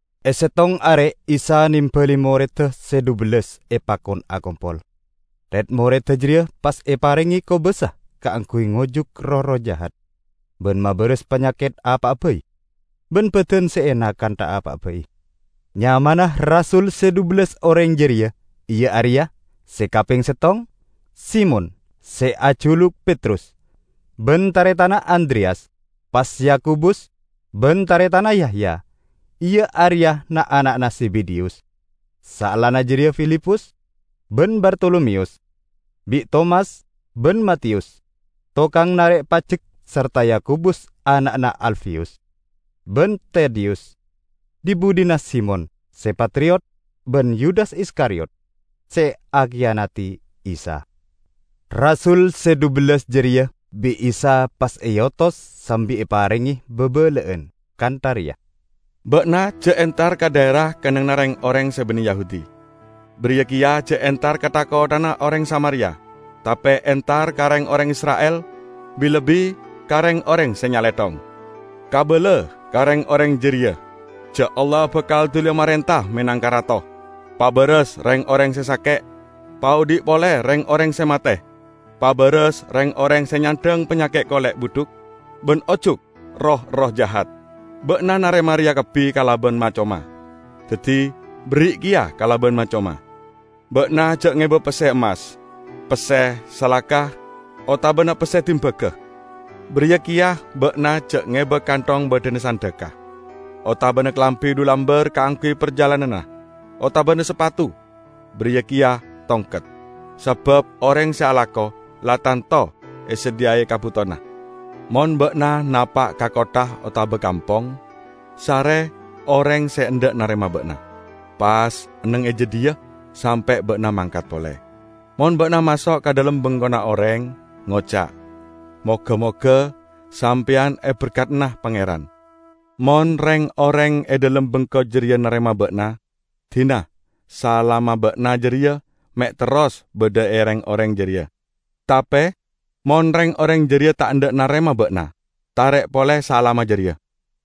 E settong are Isa nembali moredda se dhubellas epakon akompol. Red-moredda jareya pas eparenge kobasa kaangguy ngojuk roh-erroh jahat ban mabaras panyaket apa'a bai ban badan se ena kantha apa'a bai. Nyamana rasul se dhubellas oreng jareya iya areya: se kapeng settong, Simon (se ajuluk Petrus) ban taretanna Andreyas, pas Yakobus ban taretanna Yahya, iya areya na'-ana'na Zebedeyus. Saellana jareya Filipus ban Bartolomeyus, bi' Tomas ban Matiyus, tokang narek pajek sarta Yakobus ana'na Alfeyus, ban Tadeyus; dhi-budhina Simon, se patriot ban Yudas Iskariyot se akiyanadi Isa. Rasul se dhubellas jareya bi' Isa pas eotos sambi eparenge babala'an kantha reya, "Ba'na ja' entar ka dhaera kennengnganna reng-oreng se banne Yahudi. Bariya keya ja' entar ka tha-kotthana oreng Samaria. Tape entar ka reng-oreng Isra'il, bi-lebbi ka reng-oreng se nyalethong. Kabala ka reng-oreng jareya ja' Allah bakal duliya marenta menangka Rato. Pabaras reng-oreng se sake'; paodhi' pole reng-oreng se mate; pabaras reng-oreng se nyandhang panyake' kole' budhuk, ban ojuk roh-erroh jahat. Ba'na narema reya kabbi kalaban ma-coma. Daddi, berri' keya kalaban ma-coma. Ba'na ja' ngeba pesse emmas, pesse salaka, otabana pesse dimbaga. Bariya keya ba'na ja' ngeba kanthong baddhana sandhekka, otabana kalambi dhu lambar kaangguy parjalananna, otabana sapatu, bariya keya tongket. Sabab oreng se alako, la tanto esadhiyai kabutowanna. Mon ba'na napa' ka kottha otaba kampong, sare oreng se endha' narema ba'na. Pas enneng e jadhiya sampe' ba'na mangkat pole. Mon ba'na maso' ka dhalem bengkona oreng, ngoca', 'Moga-moga sampeyan eberkadana Pangeran.' Mon reng-oreng e dhalem bengko jareya narema ba'na, dina salamma ba'na jareya me' terros badha e reng-oreng jareya. Tape mon reng-oreng jareya ta' endha' narema ba'na, tarek pole salamma jareya.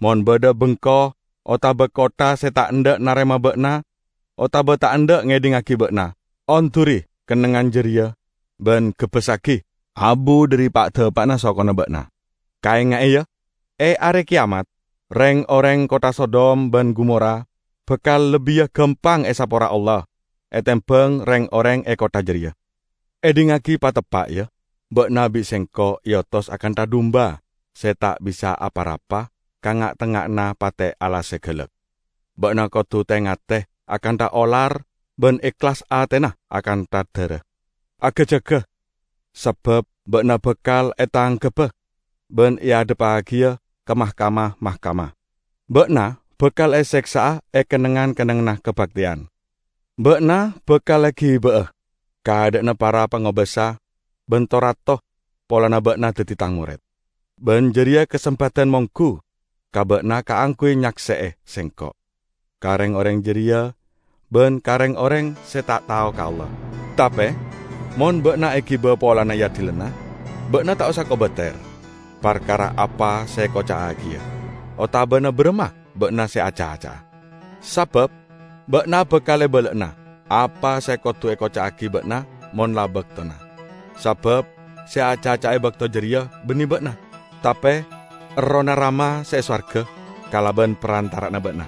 Mon badha bengko otaba kottha se ta' endha' narema ba'na otaba ta' endha' ngedhingngagi ba'na, onduri kennengngan jareya ban gebbessagi abu dhari pa'-dapa'na sokona ba'na. Kaenga'e, ya! E Are Keyamat, reng-oreng kottha Sodom ban Gomora bakal lebbiya gampang esapora Allah, etembang reng-oreng e kottha jareya!" "Edhingngagi pateppa', ya: Ba'na bi' Sengko' eotos akantha dumba se ta' bisa apa-rapa ka nga'-tengnga'anna pate' alas se galak. Ba'na kodu te-ngate akantha olar ban ehlas atena akantha dara. Aga-jaga, sabab ba'na bakal etangkebba ban eadhebbagiya ka mahkamah-mahkamah. Ba'na bakal eseksa'a e kennengngan-kennengnganna kabakteyan. Ba'na bakal egiba'a ka adha'anna para pangobasa ban to-rato polana ba'na daddi Tang mored. Ban jareya kasempadan monggu ka ba'na kaangguy nyakse'e Sengko' ka reng-oreng jareya ban ka reng-oreng se ta' tao ka Allah. Tape mon ba'na egiba polana eadilana, ba'na ta' osa kobater parkara apa se ekoca'agiya, otabana baramma ba'na se acaca'a. Sabab ba'na bakal ebala'ana apa se kodu ekoca'agi ba'na mon la baktona. Sabab se acaca e bakto jareya banne ba'na, tape Errohna Rama se e sowarga, kalaban parantara'anna ba'na.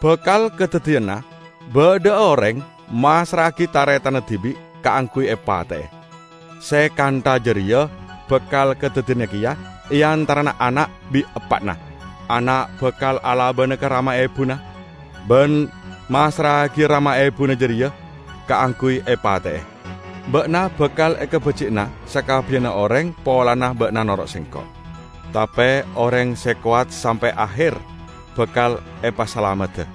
Bakal kadaddiyana badha'a oreng massra'agi taretanna dibi' kaangguy epate'e. Se kantha jareya bakal kadaddiyana keya e antarana ana' bi' eppa'na. Ana' bakal alabana ka rama ebuna, ban massra'agiya rama ebuna jareya kaangguy epate'e. Ba'na bakal ekabaji'ana sakabbiyanna oreng polana ba'na noro' Sengko'. Tape oreng se kowat sampe' aher bakal epasalamedda.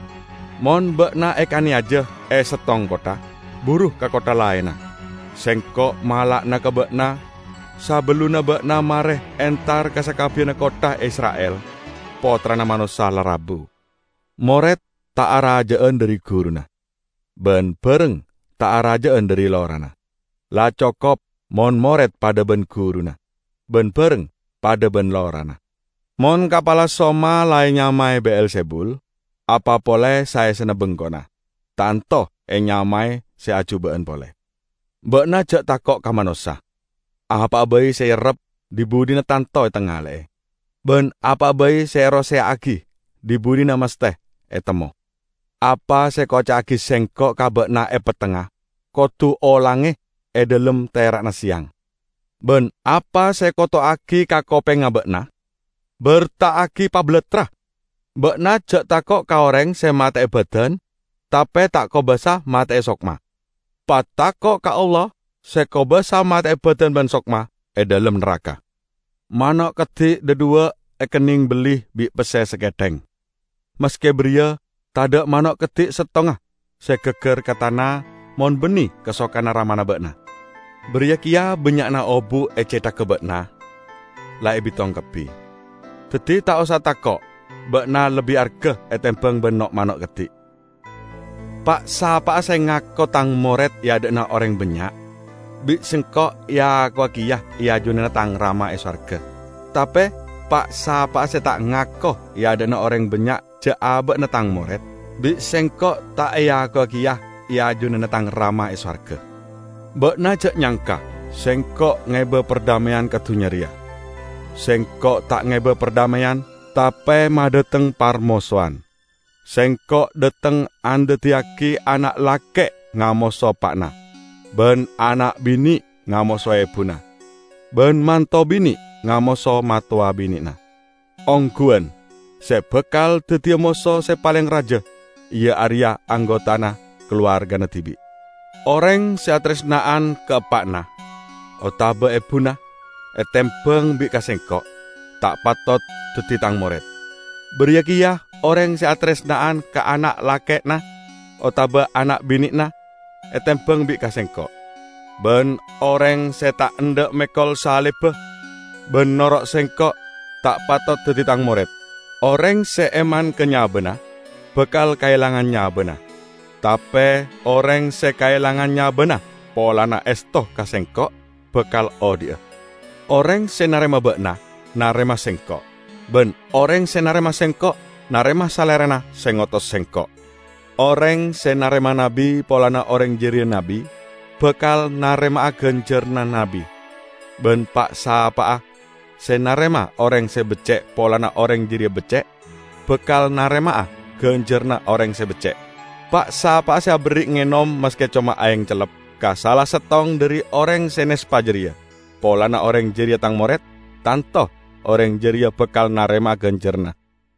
Mon ba'na ekaneyaja e settong kottha, buru ka kottha laenna. Sengko' mala'ana ka ba'na: Sabellunna ba'na mare entar ka sakabbiyanna kottha Isra'il, Pottrana Manossa la rabu. Mored ta' araja'an dhari guruna, ban bareng ta' araja'an dhari lorana. La cokop mon mored padha ban guruna, ban bareng padha ban lorana. Mon kapala soma la enyamae Be'elzebul, apa pole saessena bengkona, tanto enyamae se ajuba'an pole!" "Ba'na ja' tako' ka manossa. Apa'a bai se eerrep dhi-budhina tanto etangale'e, ban apa'a bai se eroseya'agi dhi-budhina masthe etemmo. Apa se ekoca'agi Sengko' ka ba'na e pettengnga kodu olange e dhalem tera'na seyang. Ban apa se ekoto'agi ka kopengnga ba'na, berta'agi pabalattra! Ba'na ja' tako' ka oreng se mate'e badan, tape ta' kobasa mate'e sokma. Patako' ka Allah se kobasa mate'e badan ban sokma e dhalem naraka. Mano' keddi' dhadhuwa' ekenneng belli bi' pesse saketheng. Maske bariya tadha' mano' keddi' settonga se gaggar ka tana mon banne kasokanna Ramana ba'na. Bariya keya bannya'na obu' e cethagga ba'na la ebitong kabbi. Daddi, ta' osa tako'! Ba'na lebbi arga etembang ban no'-mano' keddi'!" "Pa'-sapa'a se ngako Tang mored e adha'na oreng bannya', bi' Sengko' eakowa keya e ajunanna Tang Rama e sowarga. Tape pa'-sapa'a se ta' ngako e adha'na oreng bannya' ja' aba'na Tang mored, bi' Sengko' ta' eakowa keya e ajunanna Tang Rama e sowarga." "Ba'na ja' nyangka Sengko' ngeba pardhameyan ka dunnya reya. Sengko' ta' ngeba pardhameyan, tape madhateng parmosowan. Sengko' dhateng andaddiyagi ana' lake' ngamoso eppa'na ban ana' bine' ngamoso ebuna, ban manto bine' ngamoso mattowa bine'na. Ongguwan, se bakal daddiya moso se paleng raja, iya areya anggotana kalowargana dibi'. Oreng se ataresna'an ka eppa'na otaba ebuna etembang bi' ka Sengko', ta' patot daddi Tang mored. Bariya keya oreng se ataresna'an ka ana' lake'na otaba ana' bine'na etembang bi' ka Sengko'. Ban oreng se ta' endha' mekol salibba ban noro' Sengko', ta' patot daddi Tang mored. Oreng se eman ka nyabana, bakal kaelangana nyabana, tape oreng se kaelangan nyabana polana esto ka Sengko', bakal odhi'a." "Oreng se narema ba'na, narema Sengko'. Ban oreng se narema Sengko', narema Salerana se ngotos Sengko'. Oreng se narema nabbi polana oreng jareya nabbi, bakal narema'a ganjaranna nabbi. Ban pa'-sapa'a se narema oreng se becce' polana oreng jareya becce', bakal narema'a ganjaranna oreng se becce'. Pa'-sapa'a aberri' ngenom maske coma aeng cellep ka sala settong dhari oreng se nespa jareya, polana oreng jareya Tang mored, tanto oreng jareya bakal narema'a ganjaranna!"